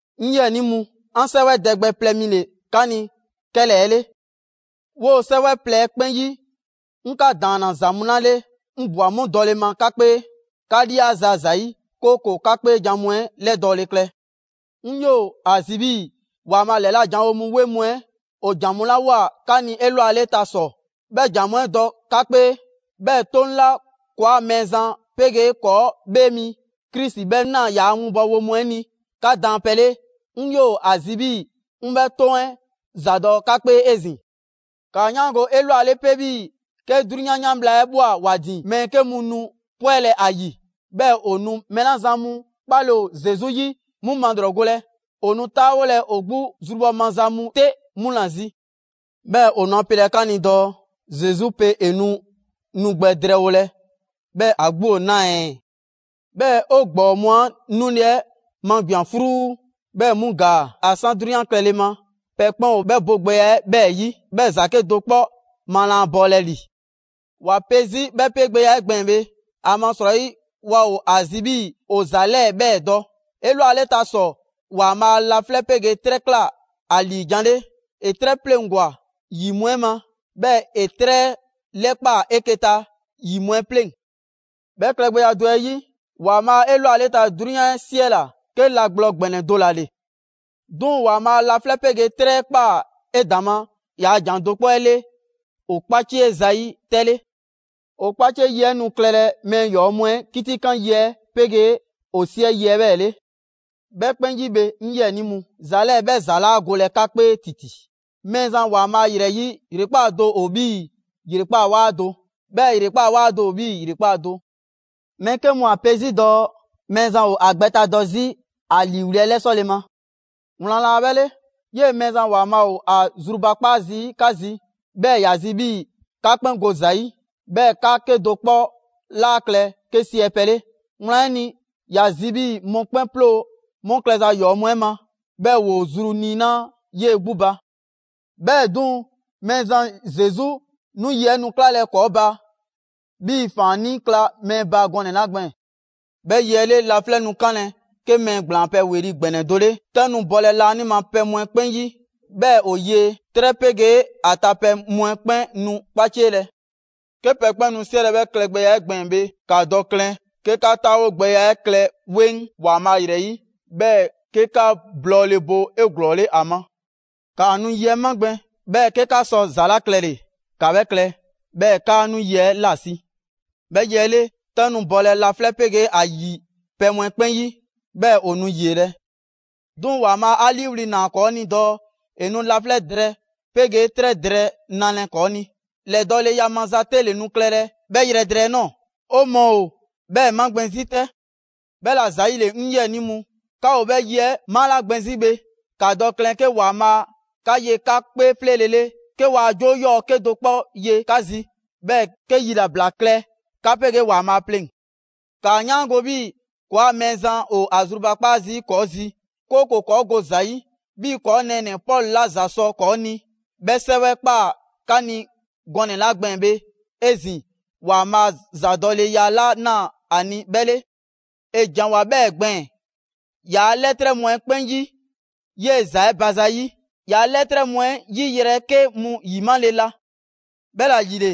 'Ŋ 'yiɛnii mu, 'an 'sɛwɛ dɛ gbɛ plɛ mi ‑le 'ka ni 'kɛlɛɛ‑ 'le. 'Woo‑ 'sɛwɛ plɛ 'ɛ 'kpɛn 'yi, 'ŋ 'ka ‑daanna ‑za mu 'la 'le 'ŋ ꞊bwa 'mu dɔle ma 'ka 'kpee, 'ka 'liaza‑ ‑zayi', 'kooko‑ 'ka 'kpeejan‑ mu 'ɛ 'lɛdɔɔle klɛ. 'Ŋ 'yoo‑ ‑a zi 'bhii‑ ‑Waanbhaa' ‑lɛla' janwo mu 'weŋ mu 'ɛ ‑o ‑jan mu 'la ꞊woa 'ka ni 'elwaleta ‑sɔ, 'bhɛ ‑jan mu 'ɛ dɔ 'ka 'kpee. 'Bhɛɛ‑ 'Toŋ 'la ‑kɔɔa' Mɛɛzan 'pegee ‑kɔɔ' ‑Bhee mi Krisi 'bhɛ ꞊naa ‑yaa winbɔwo mu 'ɛ ni 'ka daanpɛ 'le, 'ŋ 'yoo‑ ‑a zi 'bhii‑ 'ŋ 'bhɛ 'Toŋ 'ɛ ‑zadɔ' 'ka 'kpee 'ezin‑. ‑Kaa 'yaango‑ 'elwale 'pe 'bhii‑ 'ke 'drunyan 'yan bhla 'ɛ ꞊bhwa ‑wa ‑din, mɛɛ 'ke mu nu 'pwɛlɛ‑ ‑a ‑yi, 'bhɛɛ‑ ‑o nu mɛɛ 'la zan mu 'kpale‑ ‑o Zesu 'yi 'mu malrɔgolɛ. ‑O nu 'taawolɛ ‑o 'gbu zrubhɔ maza mu 'te mu ‑la zi. 'Bhɛɛ‑ ‑o nu ‑a pelɛ 'ka ni dɔɔ: «Zesu pe ‑e nu nu gbɛ drɛɛwolɛ, 'bhɛɛ‑ ‑a 'gbu ‑o 'naa‑ ɛɛ? 'Bhɛɛ‑ 'o ‑gbɔɔ mu 'a 'nule‑ 'ɛ magbian‑ 'fruu, 'bhɛɛ‑ 'mu ‑gaa; ‑a 'san 'drunyan klɛle ma, pɛ 'kpɛn ‑o 'bhɛ bogbɛya 'ɛ 'bhɛɛ‑ 'yi, 'bhɛɛ‑ ‑za 'kedo‑ 'kpɔ ma laa bɔɔlɛ ‑li!» ‑Wa pe 'zi 'bhɛ 'pegbɛya 'ɛ gbɛɛn‑ bhe, ‑amasrɔyi waa ‑o ‑a zi 'bhii‑ ‑o ‑za 'lɛɛ‑ 'bhɛɛ‑ dɔ: 'Elwaleta ‑sɔ, ‑Waanbhaa' laflɛ' 'pegee 'trɛ ꞊kla ‑a ‑liijan' 'le. ‑E 'trɛ 'pleŋgwa‑ ‑yi mu 'ɛ ma; 'bhɛɛ‑ ‑e 'trɛ 'ɛ 'lɛkpaa‑ 'eke‑ ta ‑yi mu 'ɛ pleŋ‑. 'Bhɛ klɛgbɛya do 'ɛ 'yi, ‑Waanbhaa' 'elwaleta 'drunyan 'ɛ 'siɛla‑ 'ke la gblɔ ‑gbɛnɛ do ‑la ‑le. 'Duŋ‑, ‑Waanbhaa' laflɛ' 'pegee 'trɛ 'ɛ ꞊kpaa 'edaŋma ‑yaa' ‑jan do 'kpɔ 'ɛ 'le ‑o 'kpacie zayi' 'tɛ 'le. ‑O 'kpacie yi 'ɛ nu klɛlɛ mɛɛ ‑yɔɔ' mu 'ɛ 'kitikanlɛ yi 'ɛ 'pegee ‑o 'siɛ yi 'ɛ 'bhɛɛ‑ 'le. 'Bhɛ 'kpɛn 'yi bhe, 'ŋ 'yiɛnii mu, ‑za 'lɛɛ‑ 'bhɛ ‑za 'laa golɛ 'ka 'kpee ‑titi: Mɛɛzan ‑Waanbhaa' ‑yrɛ 'yi, ‑yrekpaa' do ‑o 'bhii‑ ‑yrekpaa' 'waa do; 'bhɛɛ‑ ‑yrekpaa' 'waa do ‑o 'bhii‑ ‑yrekpaa' do. Mɛɛ 'ke mu ‑o ‑a pe 'zi dɔɔ Mɛɛzan ‑o ‑a gbɛtadɔ 'zi ‑a ‑liiwli' 'ɛ 'lɛsɔle ma. Wlan laa 'bhɛ 'le! 'Yee‑ Mɛɛzan ‑Waanbhaa' ‑o ‑a zrubakpaa zii' 'ka zi, 'bhɛɛ‑ ‑ya zi 'bhii‑ 'ka 'kpɛn go ‑za 'yi, 'bhɛɛ‑ 'ka 'kedo‑ 'kpɔ 'laa klɛ 'ke 'siɛ pɛ 'le. Wlan 'ɛ ni, ‑ya zi 'bhii‑ mɔkpɛn' 'ploo‑ 'mu klɛza ‑yɔɔ' mu 'ɛ ma, 'bhɛɛ‑ ‑woo zru niinaa' 'yee‑ 'gbu ba. 'Bhɛɛ‑ 'duŋ‑, Mɛɛzan Zesu 'nu yi 'ɛ nu 'klalɛ‑ ‑kɔɔ' ba 'bhii‑ ‑faannii' kla mɛɛ ba gɔnɛ‑ 'la gbɛɛn‑. 'Bhɛ yi 'ɛ 'le, laflɛ' nu 'kanlɛ‑ 'ke mɛɛ ‑gblaan pɛ ‑weli' ‑gbɛnɛ do 'le; 'tɛ nu bɔlɛ laanima pɛ mu 'ɛ 'kpɛn 'yi 'bhɛɛ‑ ‑o yie, 'trɛ 'pegee ‑a ta pɛ mu 'ɛ 'kpɛn nu 'kpacielɛ. 'Ke pɛ 'kpɛn nu 'siɛlɛ‑ 'bhɛ klɛgbɛya 'ɛ gbɛɛn‑ bhe, ‑ka dɔ klɛn 'ke 'ka 'taawogbɛya klɛ 'weŋ ‑Waanbhaa' ‑yrɛ 'yi, 'bhɛɛ‑ 'ke 'ka blɔɔle bo 'eglɔɔle ‑a ma. ‑Kaa nu yi 'ɛ magbɛn, 'bhɛɛ‑ 'ke 'ka sɔ ‑za 'la klɛle‑ ‑ka 'bhɛ klɛ, 'bhɛɛ‑ 'kaa 'nu yi 'ɛ 'lasi‑. 'Bhɛ yi 'ɛ 'le, 'tɛ nu bɔlɛ laflɛ' 'pegee ‑a ‑yi pɛ mu 'ɛ 'kpɛn 'yi, 'bhɛɛ‑ ‑o nu ‑yielɛ'. 'Duŋ‑ ‑Waanbhaa' 'a 'liiwli‑ ‑naa ‑kɔɔ' ni dɔɔ ‑e nu laflɛ' drɛɛ 'pegee 'trɛ drɛɛ nalɛ ‑kɔɔ' ni. ‑Lɛdɔɔleya maza 'te ‑le nu klɛlɛ 'bhɛ yrɛ drɛɛ 'ɛ ꞊nɔɔ. 'O mɔɔ ‑o 'bhɛɛ‑ magbɛn 'zi 'tɛ. 'Bhɛla‑ ‑zayile, 'ŋ 'yiɛnii mu, 'ka ‑o 'bhɛ yi 'ɛ malagbɛn 'zi bhe, ‑ka dɔ klɛn 'ke ‑Waanbhaa 'ka ye 'ka 'kpee 'fleele‑ 'le, 'ke waa 'joo 'yɔɔ‑ 'kedo‑ 'kpɔ ye 'ka zi; 'bhɛɛ‑ 'ke yilabla klɛ 'ka 'pegee ‑Waanbhaa' pleŋ‑. ‑Kaa 'yaango‑ 'bhii‑ ‑kɔɔa' Mɛɛzan ‑o ‑a zrubakpaa zii' ‑kɔɔ' zi, 'kooko‑ ‑kɔɔ' go ‑za 'yi; 'bhii‑ ‑kɔɔ' nɛɛnɛ‑ Pɔlu 'la ‑za sɔ ‑kɔɔ' ni 'bhɛ 'sɛwɛ ꞊kpaa 'ka ni gɔnɛ‑ 'la gbɛɛn‑ bhe 'ezin‑, ‑Waanbhaa' ‑zadɔleya 'la ‑naa ‑a ni, 'bhɛ 'le. ‑E ‑janwoa 'bhɛɛ‑ gbɛɛn‑ ‑yaa' 'lɛtrɛ mu 'ɛ 'kpɛn 'yi 'yee‑ ‑za 'ɛ ba zayi'. ‑Yaa' 'lɛtrɛ mu 'ɛ 'yi yrɛ 'ke mu ‑yimale la. 'Bhɛla‑ ‑yile,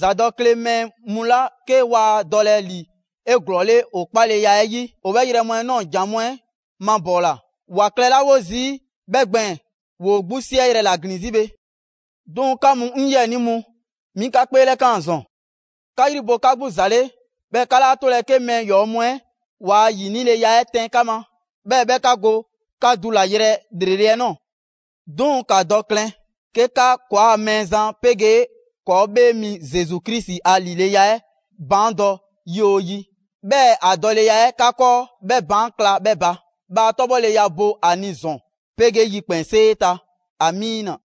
‑zadɔkle mɛɛ mu 'la 'ke waa dɔlɛ ‑li 'eglɔɔle ‑o 'kpaleya 'ɛ 'yi, ‑o 'bhɛ yrɛ mu 'ɛ ꞊nɔɔ jan mu 'ɛ mabɔɔla. ‑Wa klɛlawo zii' 'bhɛ gbɛɛn‑, ‑woo 'gbu 'siɛyrɛ‑ ‑la ‑glin 'zi bhe. 'Duŋ‑ 'ka mu 'ŋ 'yiɛnii mu, 'mi 'ka 'kpeelɛkaan ‑zɔn. 'Ka 'yri bo 'ka 'gbu ‑za 'le, 'bhɛɛ‑ 'ka 'laa 'tolɛ‑ 'ke mɛɛ ‑yɔɔ' mu 'ɛ ‑waa' 'yinileya 'ɛ 'tɛn 'ka ma, 'bhɛɛ‑ 'bhɛ 'ka go 'ka dulayrɛ ‑lrele' 'ɛ ꞊nɔɔ. 'Duŋ‑, ‑ka dɔ klɛn 'ke 'ka ‑kɔɔa' Mɛɛzan 'pegee ‑kɔɔ' 'Bhee Mi Zesu Krisi a ‑lileya 'ɛ baandɔ yi 'oo yi, 'bhɛɛ‑ ‑a dɔleya 'ɛ 'ka 'kɔɔ 'bhɛ baan' kla 'bhɛ ba. Bhaa 'tɔbhɔleya bo ‑a ni ‑zɔn 'pegee yikpɛnsee ta! Amiina.